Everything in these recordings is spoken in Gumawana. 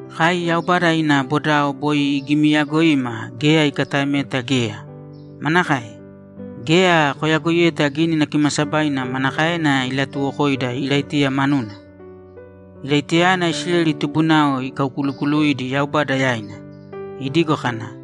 Kai Yaubada ina bodao boi igimiyaagoima geya ikataemeta geya. Manakae? Geya koyagoiyeta Gínina Kimaasabaina manakaena ilatuwokoida Iraitiya manuna? Iraitiyayana Isileli tubunao ikaukulukuluidi Yaubada yaina, idigo kana,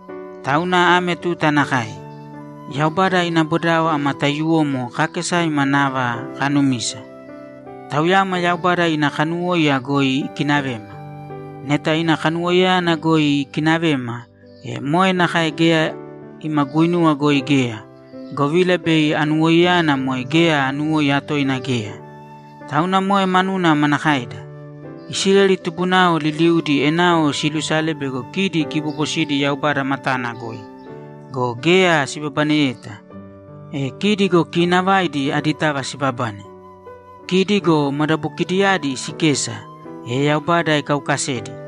Tauna ame tuta nakae; Yaubada ina bodao ama taiyuwomo kaakesaima nava kanumisa. Tauyama Yaubada ina kanuwóiya goi ikinavema. Neta ina kanuwoiyayana goi ikinavema, e moe nakae geya ima guinuwa goi geya, govila bei anuwoiyayana moe geya anuwóiya toina geya. Tauna moe manuna manakaeda? Isileli tubunao liliudi enao siilusale bego kidi kiboobosidi Yaubada matana goi go, geya sibabaneyeta. E kidi go kiinavaidi aditava sibabane. Kidi go madabokidiyadi sikesa, e Yaubada ikaukasedi.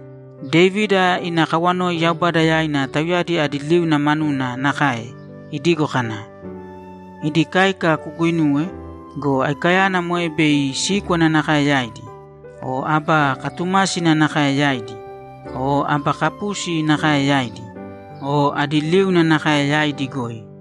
Devida ina kawanoi Yaubada yaina tauyadi adi liuna manuna nakae, idigo kana, ‘Idi káika kuguinūwe go, aikayana moe bei síkwana nakae yaidi, o aba katumásina nakae yaidi, o aba kapusi nakae yaidi, o adi liuna nakae yaidi goi.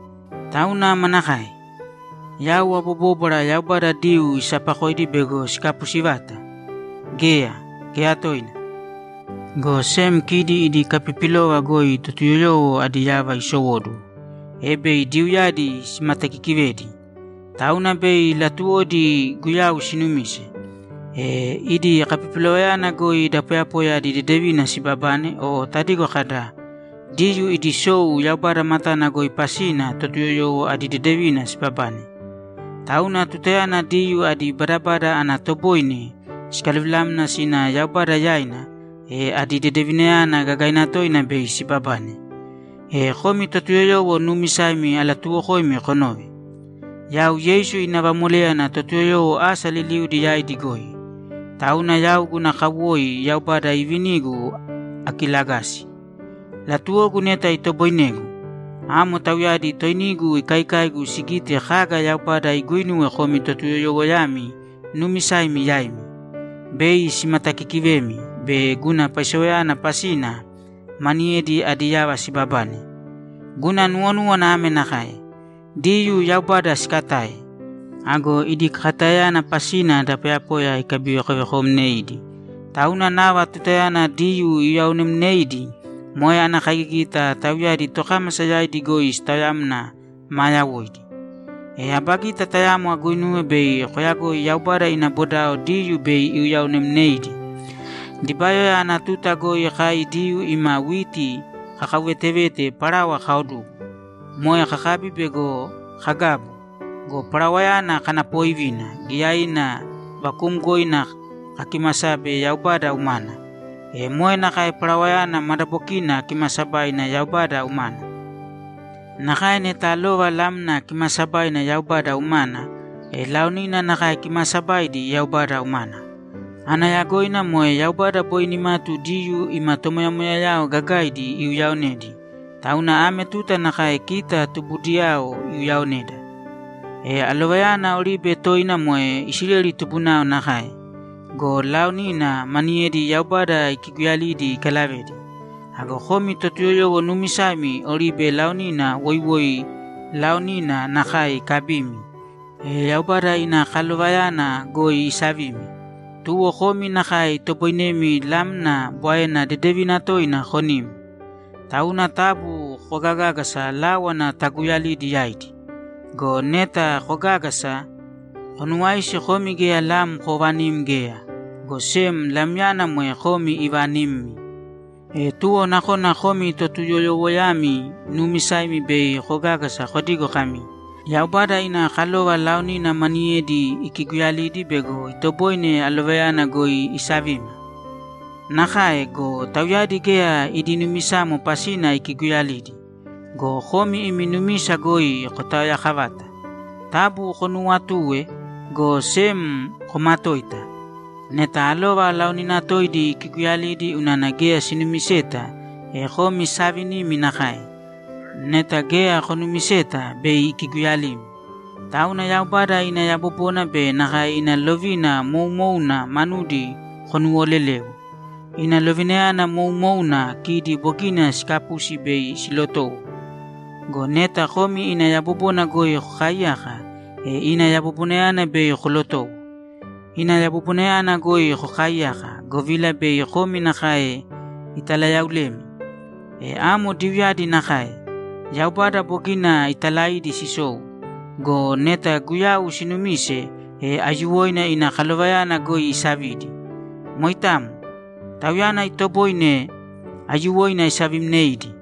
Tauna manakae? Yau abobóbwara Yaubada Diyuu isapakoidi bego sikapusi vata? Geya, geya toina! Go sem kidi idi kapipilova goi Totuyoyowo adi yava isowóduwo, e bei Diyuuyadi simatakikivedi. Tauna bei latuwodi Guyau sinumise. E idi kapipilovayana goi da poyapoya adi dedevina sibabane o tadigo kada, ‘Diyuu idi sou Yaubada matana goi pasina Totuyoyowo adi dedevina sibabane.’ Tauna tutayana Diyuu adi badabada ana toboine sikaluvilamna sina Yaubada yaina, e adi dedevinayana gagaina toina bei sibabane! E komi Totuyoyowo nuumisaimi alatuuwokoimi konōve. Yau Yeisu ina vamoléyana Totuyoyowo asa liliudi yaidi goi, tauna yau guna kawoi Yaubada iivinigu akilagasi. Latuwogu neta itoboinegu, amo tauyadi toinigu ikaikaigu sigite kaga Yaubada iguuinuwe komi Totuyoyowoyami nuumisaimi yaimi, bei simatakikivemi be guna paisewayana pasina maniyedi adi yava sibabane. Guna nuwonúwana ame nakae: Diyuu Yaubada sikatae. Ago idi kataeyana pasina da poyapoya ikabivekovekomneidi, tauna nava tutayana Diyuu iuyaonemneidi, moe ana kaigigita tauyadi tokámasa yaidi goi sitaoyamna maa yawoidi. E aba gita tayamo aguinuwe bei koyagoi Yaubada ina bodao Diyuu bei iuyaonemneidi. Dibayoya ana tuta goi kai Diyuu ima witi kakauvetevete parawa kaodugu. Moe kakabi bego kagabu go, parawayana kanaapoivina giyaina vakuumgoina kakimasabe Yaubada umana. E moe nakae parawayana madabokina kimaasabaina Yaubada umana. Nakae neta alova lamna kimaasabaina Yaubada umana, e laonina nakae kimaasabaidi Yaubada umana. Ana yagoina moe Yaubada boi nimatu Diyuu ima tomoyamoyayao gagaidi iuyaonedi, tauna ame tuta nakae kita tubudiyao iuyaoneda. E alovayana oribe toina moe Isileli tubunao nakae go, laonina maniyedi Yaubada ikiguyalidi ikalavedi. Ago komi Totuyoyowo nuumisaimi oribe alovaina woiwoi laonina nakae ikabimi, e Yaubada ina kalovayana goi isavimi, tuwo komi nakae itoboinemi lamna bwaena dedevina toina konim. Tauna taabu kogagāgasa láwana taguuyalidi yaidi! Go neta kogágasa, konuwāisi komi geya lam koovanim geya, go sem lamyana moe komi ivaanimmi. E tuwo nakona komi Totuyoyowoyami nuumisaimi bei kogágasa, kodigo kami, ‘Yaubada ina kalova laonina maniyedi ikiguyalidi bego itoboine alovayana goi isavima.’ Nakae go, tauyadi geya idi numisamo pasina ikiguyalidi go, komi imi numisa goi kotaoyakavata. Taabu konuuwatūe, go sem koomatōita! Neta alova laonina toidi ikiguyalidi unana geya sinumiseta, e komi saavinimi nakae. Neta geya konumiseta, bei ikiguyalimi. Tauna Yaubada ina yabobona be nakae ina lovina moumouna manudi konuwolelēu. Ina lovinayana moumouna kidi bogina siikapusi bei silotowo. Go neta komi ina yabobona goi kokaaiyaka, e ina yabobonayana bei kolotowo. Ina yabobonayana goi kokaaiyāka, govila bei komi nakae italayaulemi. E amo Diyuuyadi nakae. Yaubada bogina italaidi sisou go, neta Guyau sinumise, e aiyuwoina ina kalovayana goi isavidi. Moitamo. Tauyana itoboine aiyuwoina isavimneidi.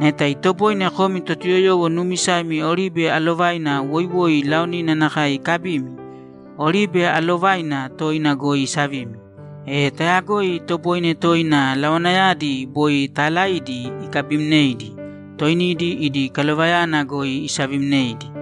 Neta itoboine komi Totuyoyowo nuumisaimi oribe alovaina woiwoi laonina nakae ikabimi, oribe alovaina toina goi isavimi, e tayagoi itoboine toina lawanayadi boi itaalaidi, ikabimneidi, toinidi idi kalovayana goi isavimneidi.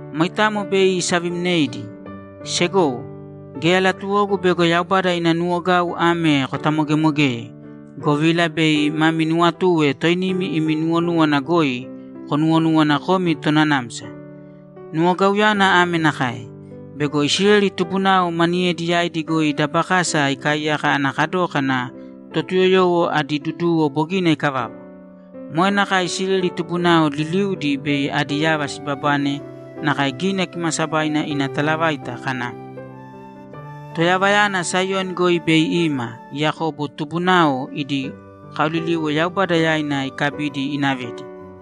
Moitamo bei isavimneidi. Segowo, geya latuwogu bego Yaubada ina nuwogau ame kotamogemogeye, govila bei mami nuwatue toinimi imi nuwonúwana goi konuwonúwana komi tonanamsa. Nuwogauyana ame nakae: Bego Isileli tubunao maniyedi yaidi goi dabakasa ikaaiyaka ana kadókana Totuyoyowo adi duduwo bogina ikavava. Moe nakae Isileli tubunao liliuudi bei adi yava sibabane nakae Gínina Kimaasabaina ina talavaita kana, ‘Toyavayana Saiyoni goi bei ima Yakobo tubunao idi kaoliliwo Yaubada yaina ikabidi inavedi.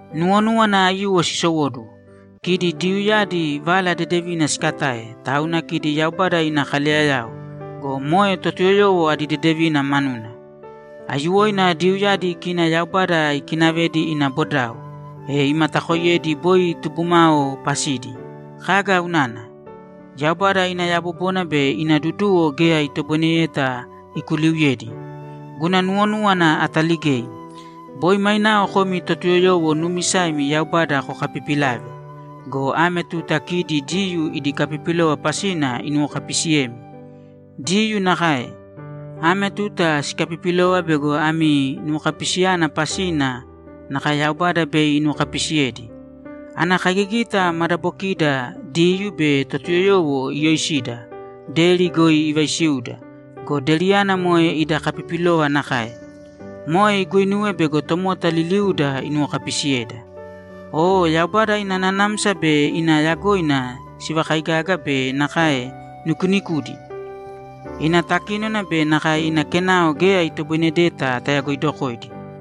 Nuwonúwana aiyuwo sisowóduwo. Kidi Diyuuyadi Vala Dedevina sikatae, tauna kidi Yaubada ina kaleyayao go, moe Totuyoyowo adi dedevina manuna. Aiyuwoina Diyuuyadi kina Yaubada ikinavedi ina bodao, e imatakoiyedi boi tubumao pasidi. Kaga unana? Yaubada ina yabobona be ina duduwo geya itoboineyeta ikuliuyedi. Guna nuwonúwana ataligei. Boi mainao komi Totuyoyowo nuumisaimi Yaubada kokapipilave go, ame tuta kidi Diyuu idi kapipilova pasina inuwokapisiyemi. Diyuu nakae; ame tuta sikapipilova bego ami nuwokapisiyana pasina nakae Yaubada bei inuwokapisiyedi. Ana kaigigita madabokida, Diyuu be Totuyoyowo, iyoisida, deri goi ivaisiuda go, deriyana moe ida kapipilova nakae. Moe iguinuwe bego tomota liliuuda inuwokapisiyeda. O Yaubada ina nanamsa be ina yagoina sivakaigaga be nakae nikuunikudi! Ina takínona be nakae ina kenao geya itoboinedeta tayagoidokoidi!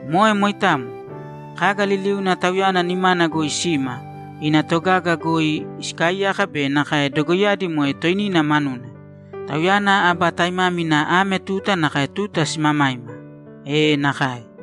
Moe moitamo. Kaga liliuna Tauyana nimana goi sima, ina togaga goi sikaaiyaka be nakae dogoiyadi moe toinina manuna. Tauyana aba taimámina ame tuta nakae tuta simamaima! E nakae!